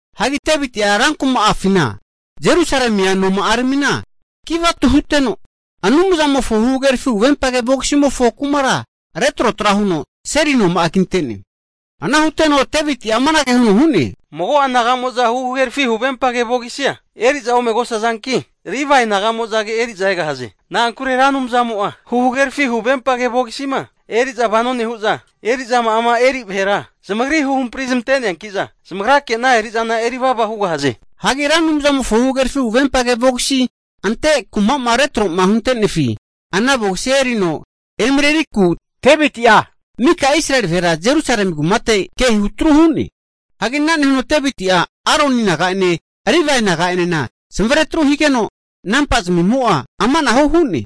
Hagi Deviti'a rankuma'afina Jerusalemi noma'aramina kivatu huteno, Anumzamofo huhagerafi huvempage vogisimofo kumara retrotra huno seli noma'a kinte'ne. Ana huteno Deviti'a amanage huno hu'ne, Mago'a naga'mo'za huhagerafi huvempage vogisia eri'za omegosazanki, Livae nagamozage eri'za egahaze. Na'ankure Ra Anumzamo'a huhagerafi huvempage vogisima eri'za vano nehu'za, eri'zama'ama eri vahera zamagri huhampri zamante'neankiza zamagrake ana eri'zana eri vava hugahaze. Hagi Ra Anumzamofo huhagerafi huvempage vogisima ante kuma'ma retro'ma huntenefi ana vogisia erino emareriku Deviti'a mika Israeli vahera Jerusalemi kumate ke hutru hu'ne. Hagi ana nehuno Deviti'a Aroni naga'ene Livae naga'enena zamavare atru higeno nampa zamimo'a amanahu hu'ne.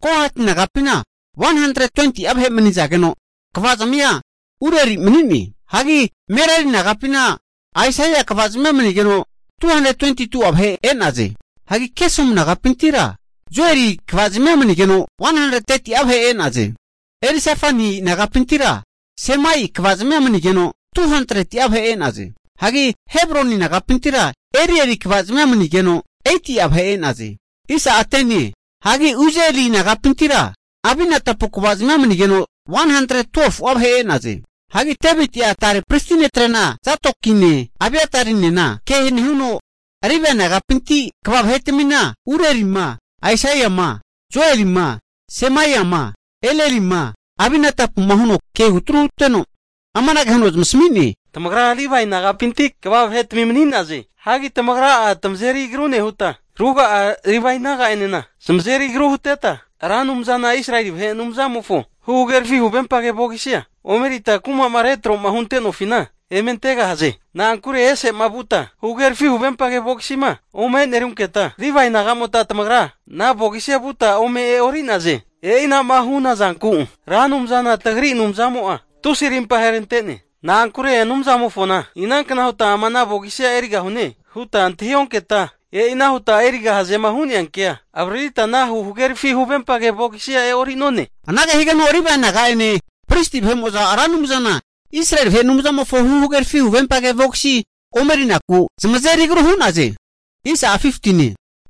Kohati nagapina 120'a vahe manizageno, kvazmia Urieli mani'ne. Hagi Merari nagapina Asaia kvazmia manigeno 220'a vahe e'naze. Hagi Gesomu nagapintira Joeli kvazmia manigeno 130'a vahe e'naze. Elizafani nagapintira Semaia kvazmia manigeno, 200'a vahe e'naze. Hagi Hebroni nagapintira Elieri kvazmia manigeno, 80'a vahe e'naze. Hagi Uzieli nagapintira Aminadapu kvazmia manigeno, 112'a vahe e'naze. Hagi Deviti'a tare pristi netrena Zadokine Abiatarinena ke nehuno Livae nagapinti kva vahetmina Urielima, Asaiama, Joelima, Semaiama, Elielima, Abinadapuma huno ke hutru huteno, amanage huno zamasami'ne, Tamagra Livae nagapinti kva vahetami mani'naze. Hagi tamagra'a tamazeri agru nehuta, ruga'a Livae naga'enena zamazeri agru huteta, Ra Anumzana Israeli vahe Anumzamofo huhagerafi huvempage vogisia omerita kuma'ma retrotra'ma huntofina eme antegahaze. Na'ankure ese'ma vuta huhagerafi huvempage vogisima omenerunketa Livae naga'mota tamagra ana vogisia vuta ome e'ori'naze. E'inama hu'naza zanku Ra Anumzana tagri Anumzamo'a tusi arimpa aherante'ne. Na'ankure Anumzamofona inankna huta ama ana vogisia erigahune huta antahi onketa, e'ina huta erigahazema hu'neankea avaririta ana huhagerafi huvempage vogisia e'orinone. Anage higeno Livae naga'ene pristi vahe'mo'za Ra Anumzana Israeli vahe Anumzamofo huhagerafi huvempage vogisi omerinaku zamazeri agru hu'naze.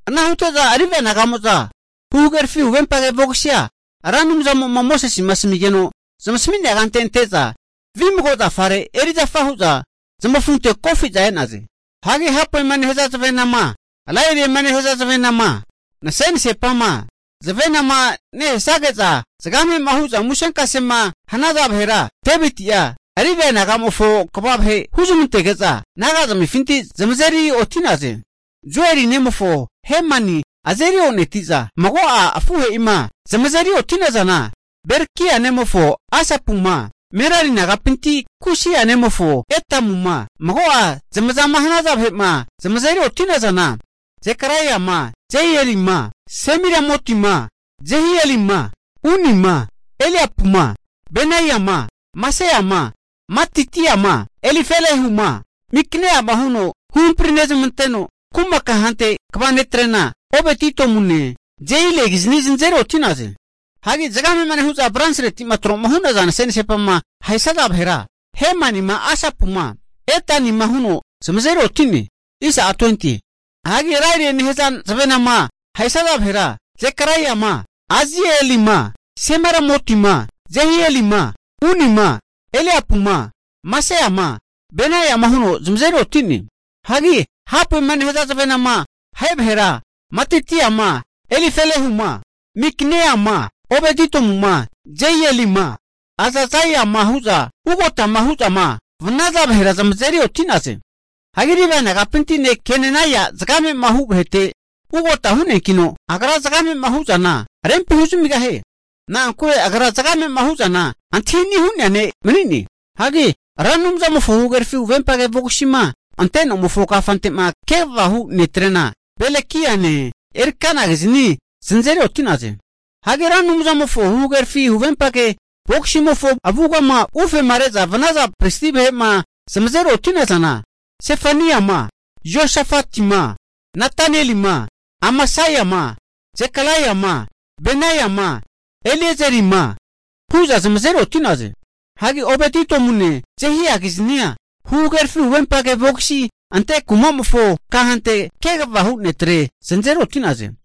Ana hute'za Livae naga'mo'za huhagerafi huvempage vogisia Ra Anumzamo'ma Mosesema asamigeno zamasami'nea kante ante'za, vimago zafare eri'zafa hu'za zamafunte kofi'za e'naze. Hagi, hapue nehaza zavenama, lailiema nehaza zavenama, nasenasepama, zavenane nehesage'za zagame'ma hu'za musenkasema hanaza vahera Deviti'a Livae nagamofo kva vahe huzmantege'za nagazamifinti zamazeri oti'naze. Hagi Joeli nemofo Hemani azeri oneti'za, mago'a afuhe'ima zamazeri oti'nazana, Berekia nemofo Asapuma, Merari nagapinti Kusaia nemofo Etamuma, mago'a zamazama hanaza vahe'ma zamazeri oti'nazana, Zekaraiama, Jazielima, Semiramotima, Jehielima, Unima, Eliapuma, Benaiama, Maseama, Matitiama, Elifelehuma, Mikneiama huno huhampri nezmanteno, kuma kahante kva netrena Obed Idomune, Jeielikizni zanazeri oti'naze. Hagi zagamema nehu'za bronsiretima tro'ma hu'naza nase'nasepama ahesaza vahera, Hemanima, Asapuma, Etanima huno zamazeri oti'ne. Hagi Lairie nehaza zavenama ahesaza vahera, Zekaraiama, Azielima, Semiramotima, Jehielima, Unima, Eliapuma, Maseama, Benaiama huno zamazeri oti'ne. Hagi hapuema nehaza zavenama ahe vahera Matitiama, Elifelehuma, Mikneia'ma, Obed-Idomuma, Jeielima, Azazaiama hu'za ugotama hu'zama vanaza vahera zamazeri oti'naze. Hagi Livae nagapinti ne' Kenenai'a zagamema hu vahete ugota hu'neankino, agra zagamema hu'zana rempi huzamigahie. Na'ankure agra zagamema hu'zana antahini hu'nea ne' mani'ne. Hagi Ra Anumzamofo huhagerafi huvempage vogisima ante nomofo kafante'ma kegavama hu netrena, Belekiane Elkanakizni zanazeri oti'naze. Hagi Ra Anumzamofo huhagerafi huvempage vogisimofo avugama ufema re'za vanaza pristi vahe'ma zamazeri oti'nazana, Sefaniama, Joshafatima, Natanielima, Amasaima, Zekaraiama, Benaima, Eliezerima hu'za zamazeri oti'naze. Hagi Obed Idomune, Jehiakiznia huhagerafi huvempage vogisima ante kumamofo kahante kegava hu netre zanazeri oti'naze.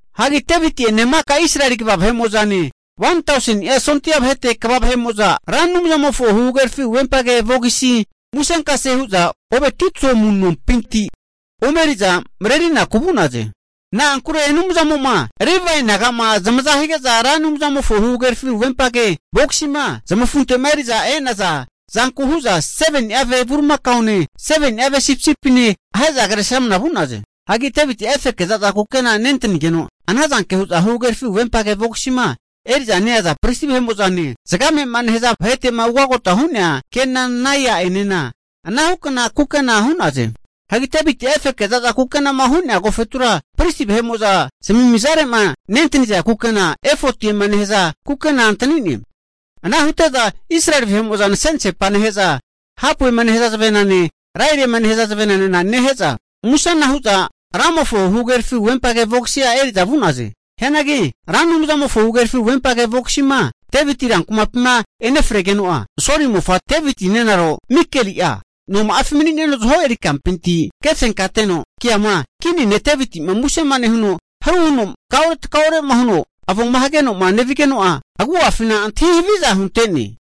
Hagi Deviti'ene maka Israeli kva vahe'mo'zane, 1000ni'a sondia vahete kva vahe'mo'za Ra Anumzamofo huhagerafi huvempage vogisima musenkase hu'za Obed Idomu nompinti omeriza marerinaku vu'naze. Hagi Anumzamo'ma Livae nagama zamaza hige'za Ra Anumzamofo huhagerafi huvempage vogisima zamafunte'ma eri'za e'naza zanku hu'za 7ni'a ve bulimakaone, 7ni'a ve sipisipine, ahe'za kresramna vu'naze. Hagi Deviti'a efeke za'za kukena nentanigeno, ana zanke hu'za huhagerafi huvempage vogisima eri'za neaza pristi vahe'mo'zane, zagamema nehaza vahe'ene, zagame'ma nehaza vahetema ugotama hu'nea ne' Kenenai'enena anahukna kukena hu'naze. Hagi Deviti'a efeke za'za kukenama hu'nea agofetura pristi vahe'mo'zama zamimizare'ma nentaniza kukena efotiema nehaza kukena antani'ne. Ana hute'za Israeli vahe'mo'za nase'nasepana nehe'za, hapuema nehaza zavenane, Lairiema nehaza zavenanena nehe'za musena hu'za Ramofo huhagerafi huvempage vogisia eri'za vu'naze. Hianagi Ra Anumzamofo huhagerafi huvempage vogisima Deviti rankumapima enefregeno'a, Soli mofa Deviti nenaro Mikali'a noma'afi mani'neno zaho eri kampinti kefenkateno ke'ama, kini ne' Devitima musema nehuno haru huno takaure takaure'ma huno avoma hagenoma nevigeno'a, agu'afina antahi haviza hunte'ne.